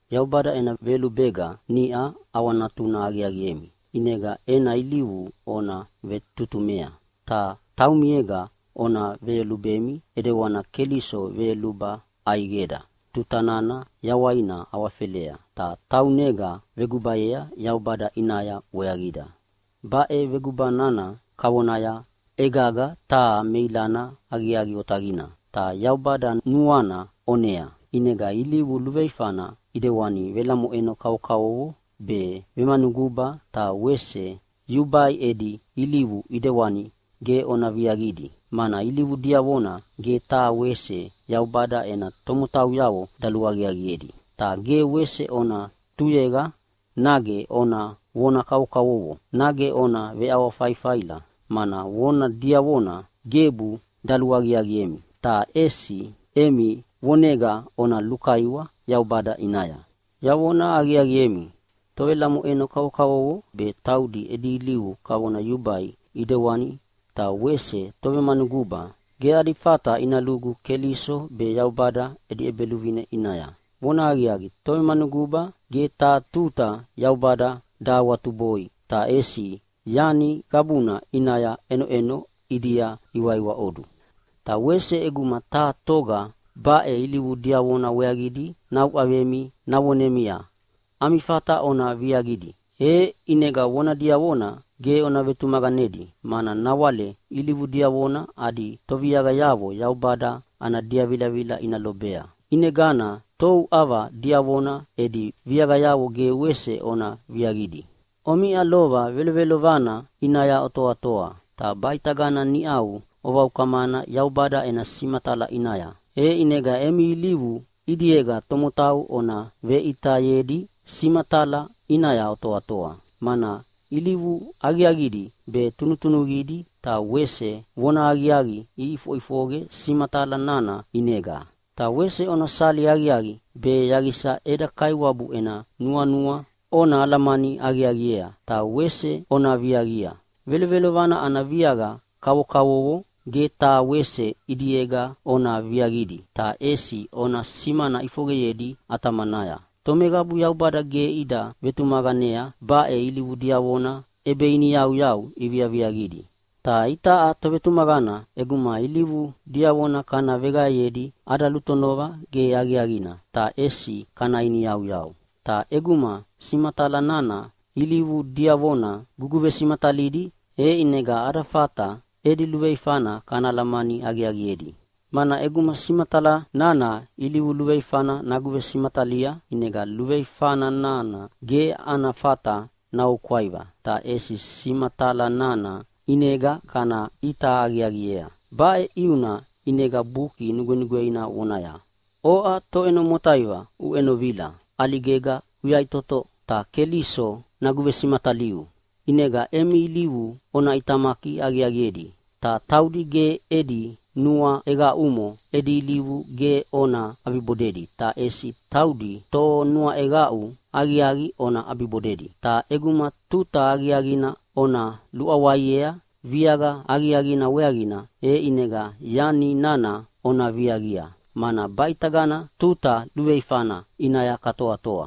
Yaubada ena veyolubega niʼa ʼawanatuna aqiaqiemi, ʼinega ena ilivu ona vetutumea. Ta taumiega ona veyolubemi ʼedewana Keliso veyoluba ʼaiqeda tuta nana yawaina awafelea, ta taunega vegubayea Yaubada ʼinaya weaqida. Baʼe veguba nana kavona egaga taha meilana aqiaqi otaqina, ta Yaubada nuana ʼonea. ʼInega ilivu luveifana ʼidewani velamoʼeno kavokavovo be, vemanuguba ta wese yubai edi ilivu ʼidewani ge ona viaqidi, mana ilivu diavona ge taha wese Yaubada ena tomotauyavo daluaqiaqiedi. Ta ge wese ona tuyeqa nage ona vona kavokavovo, nage ona veʼawafaifaila, mana vona diavona gebu daluaqiaqiemi. Ta ʼesi emi vonega ona lukaiwa Yaubada ʼinaya. Yavona aqiaqiemi, tovelamoʼeno kavokavovo be taudi edi ilivu kavona yubai ʼidewani ta wese tovemanuguba ge adi fata ina lugu Keliso be Yaubada edi ʼEbeluvine ʼinaya. (Vonahaqiaqi, tovemanuguba ge taha tuta Yaubada dahawatuboi, ta ʼesi yani qabuna ʼinaya ʼenoʼeno ʼidia iwaiwaʼodu.) Ta wese ʼeguma taha toga baʼe ilivu diavona weaqidi nauʼavemi navonemia, “Ami fata ona viaqidi.” e ʼinega vona diavona ge ona vetumaqanedi, mana nawale ilivu diavona adi toviaqayavo Yaubada ana diavilavila ina lobea. ʼInegana touʼava diavona edi viaqayavo ge wese ona viaqidi. Omiʼa lova velovelovana ʼinaya otoatoa, ta baʼitagana niʼau ovaukamana Yaubada ena simatala ʼinaya, e ʼinega emi ilivu ʼidiega tomotau ona veʼitayedi simatala ʼinaya otoatoa. Mana ilivu aqiaqidi be tunutunuqidi ta wese vonahaqiaqi iʼifoʼifoqe simatala nana ʼinega. Ta wese ona sali aqiaqi be yaqisa eda Kaiwabu ena nuanua ona alamani aqiaqiea, ta wese ona viaqia. Velovelovana ana viaqa kavokavovo ge taha wese ʼidiega ona viaqidi, ta ʼesi ona simana ʼifoqeyedi ʼatamanaya. Tomeqabu Yaubada ge ida vetumaqanea baʼe ilivu diavona ʼebeiniyauyau iviaviaqidi. Ta itaʼa tovetumaqana ʼeguma ilivu diavona kana veqaeyedi ada lutonova ge aqiaqina, ta ʼesi kana iniyauyau. Ta ʼeguma simatala nana ilivu diavona guguvesimatalidi, e ʼinega ada fata edi luveifana kana alamani aqiaqiedi, mana ʼeguma simatala nana ilivu luveifana naguvesimatalia, ʼinega luveifa nana ge ana fata naoukwaiva, ta ʼesi simatala nana ʼinega kana ʼita aqiaqiea. Baʼe ʼiuna ʼinega Buki Nugwenugweina vonaya, “Oʼa toʼeno motaiva uʼenovila! ʼAligega uyaʼitoto, ta Keliso naguvesimataliu.” ʼInega emi ilivu ona ʼitamaki aqiaqiedi, ta taudi ge edi nuaʼeqaʼumo edi ilivu ge ona ʼabibodedi, ta ʼesi taudi tonuaʼeqaʼu aqiaqi ona ʼabibodedi. Ta ʼeguma tuta aqiaqina ona luʼawaiea viaqa aqiaqina weaqina, e ʼinega yani nana ona viaqia, mana baʼitagana tuta luveifana ʼinaya katoatoa.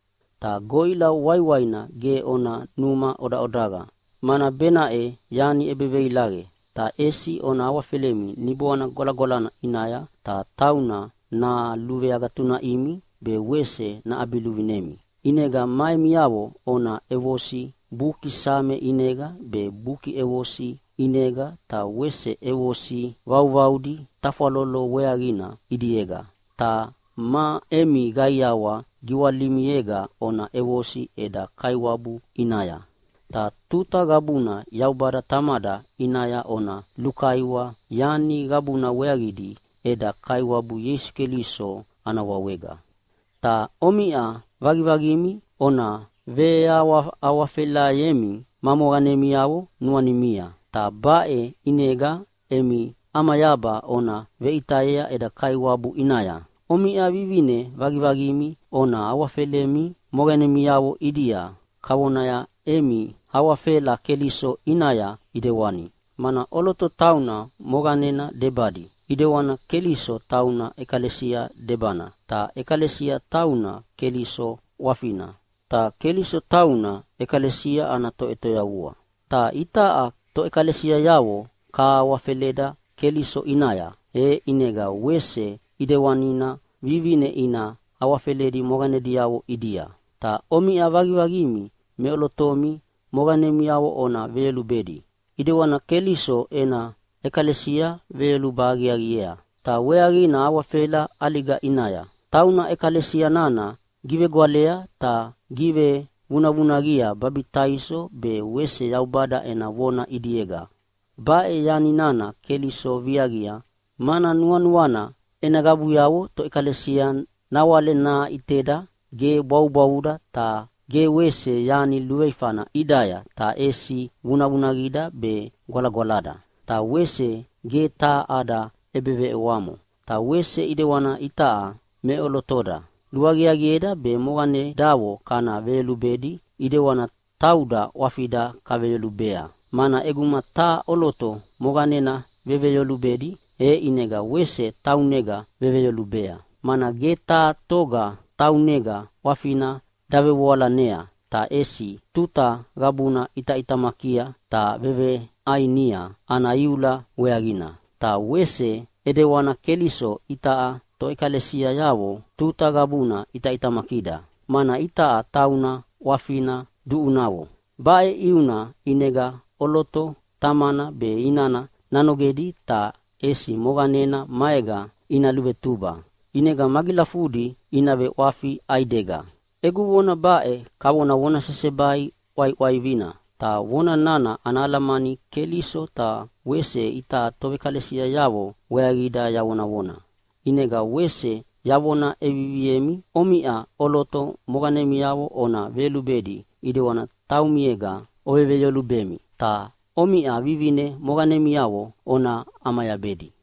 Ta goʼila waiwaina ge ona numa ʼodaʼodaqa, mana benaʼe yani ʼebeveilaqe, ta ʼesi ona awafelemi Niboana Gwalagwalana ʼinaya ta tauna naluveagatunaʼimi be wese naʼabiluvinemi. ʼInega ma emiavo ona ʼevosi Buki Same ʼinega be, Buki ʼEvosi ʼinega ta wese ʼevosi vauvaudi tafwalolo weaqina ʼidiega, ta ma emi qaiawa giwalimiega ona ʼevosi eda Kaiwabu ʼinaya. Ta tuta qabuna Yaubada Tamada ʼinaya ona lukaiwa yani qabuna weaqidi eda Kaiwabu Ieisu Keliso ana wawega. Ta omiʼa vaqivaqimi ona veawahawafelayemi ma moqanemiavo nuanimia, ta baʼe ʼinega emi ʼamayaba ona veʼitayea eda Kaiwabu ʼinaya. Omiʼa vivine vaqivaqimi ona awafelemi moqanemiavo ʼidia kavona emi awafela Keliso ʼinaya ʼidewani mana ʼoloto tauna moqanena debadi, ʼidewani Keliso tauna ʼekalesia debana, ta ʼekalesia tauna Keliso ʼwafina, ta Keliso tauna ʼekalesia ana Toʼetoyavua. Ta itaʼa toʼekalesiayavo kahawafeleda Keliso ʼinaya, e ʼinega wese ʼedewanina vivine ina awafeledi moqanediavo ʼidia. Ta omiʼa vaqivaqimi meʼolotomi moqanemiavo ona veyolubedi, ʼedewana Keliso ena ʼekalesia veyoluba aqiaqiea, ta weaqina awafela ʼaliga ʼinaya. Tauna ʼekalesia nana givegwalea be givevunavunaqia babitaiso be wese Yaubada ena vona ʼidiega. Baʼe yani nana Keliso viaqia, mana nuanuana ena qabuyavo toʼekalesia nawale naʼiteda ge bwavubwavuda ta ge wese yani luveifana ʼidaya, ta ʼesi vunavunaqida be gwalagwalada, ta wese ge taha ada ʼebeveʼewamo. Ta wese ʼidewana itaʼa meʼolotoda luaqiaqieda be moqanedavo kana veyolubedi ʼedewana tauda ʼwafida kaveyolubea. Mana ʼeguma taha ʼoloto moqanena veveyolubedi, e ʼinega wese taunega veveyolubea. Mana ge taha toga taunega ʼwafina davevoalanea, ta ʼesi tuta qabuna ʼitaʼitamakia ta veveʼainia ana iula weaqina. Ta wese ʼedewana Keliso itaʼa toʼekalesiayavo tuta qabuna ʼitaʼitamakida, mana itaʼa tauna ʼwafina duʼunavo. “Baʼe ʼiuna ʼinega ʼoloto tamana be inana nanogedi, ta ʼesi moqanena maega ina luvetuba, ʼinega magilafudi ina veʼwafi ʼaidega.” Egu vona baʼe kavona vona sesebai ʼwaiʼwaivina, ta vona nana ana alamani Keliso be wese itaʼa toʼekalesiayavo weaqida yavonavona. ʼInega wese yavona ʼeviviemi, omiʼa ʼoloto moqanemiavo ona veyolubedi ʼidewani taumiega oveveyolubemi, ta omiʼa vivine moqanemiavo ona ʼamayabedi.